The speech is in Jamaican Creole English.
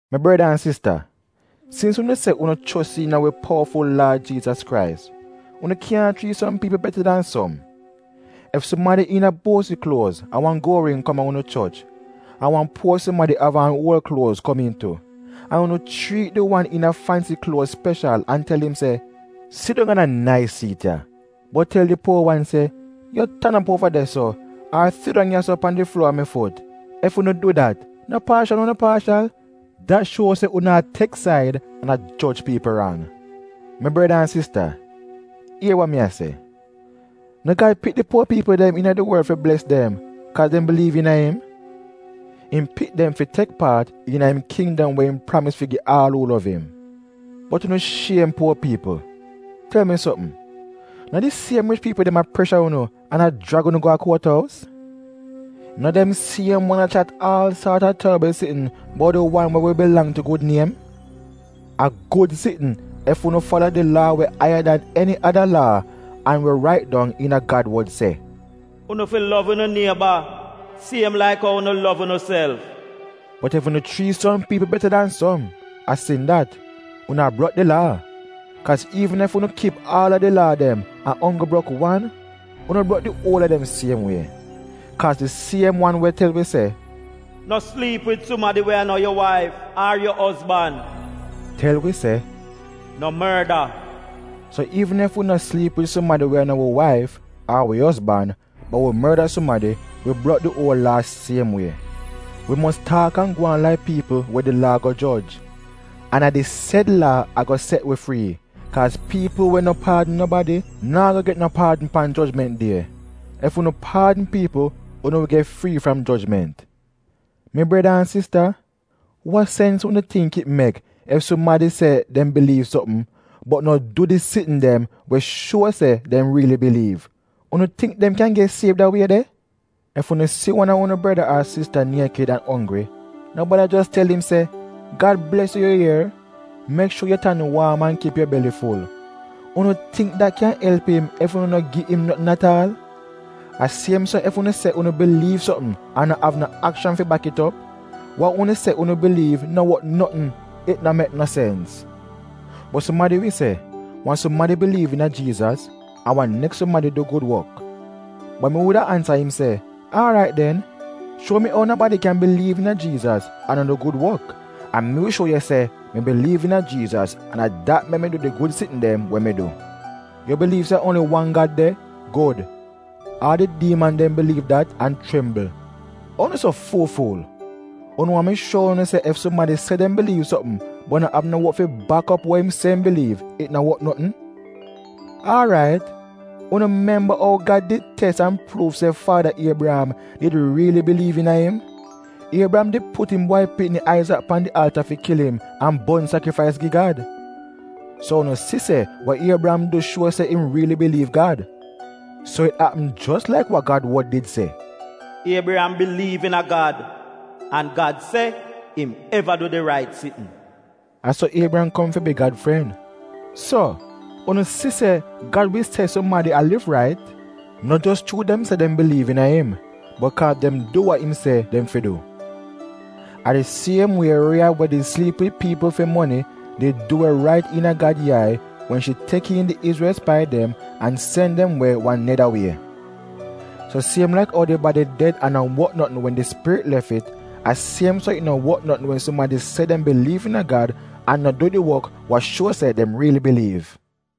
Mi breda an sista, sins unu se unu chos iina wi powaful Laad Jiizas Krais, unu kyaahn chriit som piipl beta dan som. Ef sumadi iina buosi kluoz an wan guol ring kom a unu choch, an wan puo sumadi we av aan uol kluoz kom iin tu, an unu chriit di wan iina fansi kluoz speshal an tel im se, “Sidong a da nais siit ya,” bot tel di puo wan se, “yu tan op uova de-so,” ar “sidong ya-so pan di fluor a mi fut,” ef unu du dat, no paashal unu paashal? Dat shuo se unu baiyas an a joj piipl rang. Mi breda an sista, ier wa mi a se. No Gad pik di puo piipl iina di worl fi bles dem kaaz dem biliiv iina im? Im pik dem fi tek paat iina im kindom wa im pramis fi gi aal uu lov im. Bot unu shiem puo piipl. Tel mi sopm, no di siem rich piipl dem a presha unu an a jrag unu go a kuot ous? No dem siem wan a chat aal saat a torbl sitn buot di Wan we wi bilang tu gud niem? A gud sitn ef unu fala di Laa we aiya dan eni ada laa, an we rait dong iina Gad wod se, “Unu fi lov unu nieba siem laik ou unu lov unuself.” Bot ef unu chriit som piipl beta dan som, a sin dat, unu a brok di Laa. Kaaz iivn ef unu kip aal a di Laa dem an onggl brok wan, unu brok di uol a dem siem wie. Kaaz di siem wan we tel wi se, “No sliip wid sumadi we a no yu waif ar yu ozban,” tel wi se, “No morda.” So iivn ef wi no sliip wid sumadi we a no wi waif, ar wi ozban, bot wi morda sumadi, wi brok di uol Laa siem wie. Wi mos taak an gwaan laik piipl we di Laa ago joj. An a di sed Laa ago set wi frii, kaaz piipl we no paadn nobadi, naa go get no paadn pan jojment die. Ef unu paadn piipl unu wi get frii fram jojment. Mi breda an sista, wa sens unu tingk it mek ef sumadi se dem biliiv sopm, bot no du di sitn dem we wi shuo se dem riili biliiv? Unu tingk dem kyan get siev da wie de? Ef unu si wan a unu breda ar sista niekid an onggri, no bada jos tel im se, “Gad bles yu yu ier. Mek shuor yu tan waam an kip yu beli ful.” Unu tingk dat kyan elp im ef unu no gi im notn at aal? A siem so ef unu se unu biliiv sopm an no av no akshan fi bak it op, wa unu se unu biliiv no wot notn — it no mek no sens. Bot sumadi wi se, “Wan sumadi biliiv iina Jiizas, an wan neks sumadi du gud wok.” Bot mi wuda ansa im se, “Aarait den, shuo mi ou nobadi kyan biliiv iina Jiizas an no du gud wok, an mi wi shuo yu se mi biliiv iina Jiizas an a dat mek mi du di gud sitn dem we mi du.” Yu biliiv se a onggl wan Gad de — gud! Aal di diiman dem biliiv dat an chimbl. Ou unu so fuul-fuul! Unu waahn mi shuo unu se, ef sumadi se dem biliiv sopm bot no av no wok fi bak op wa im se im biliiv, it no wot notn? Aarait, unu no memba ou Gad did tes an pruuv se faada Iebriyam did riili biliiv iina im. Iebriyam did put im bwai pikni Aizak pan di alta fi kil im an bon sakrifais gi Gad? So unu si se wa Iebriyam du shuo se im riili biliiv Gad. So it apm jos laik wa Gad wod did se, “Iebriyam biliiv iina Gad, an Gad se im eva du di rait sitn.” A so Iebriyam kom fi bi Gad fren. So unu si se Gad wi se sumadi a liv rait, no jos chuu dem se dem biliiv iina im, bot kaaz dem du wa im se dem fi du. A di siem wie Rieyab we did sliip wid piipl fi moni, did du we rait iina Gad yai wen shi tek iin di Izrel spai dem an sen dem we wan neda wie. So siem laik ou di badi ded an no wot notn wen di spirit lef it, a siem so it no wot notn wen sumadi se dem biliiv iina Gad an no du di wok wa shuo se dem riili biliiv.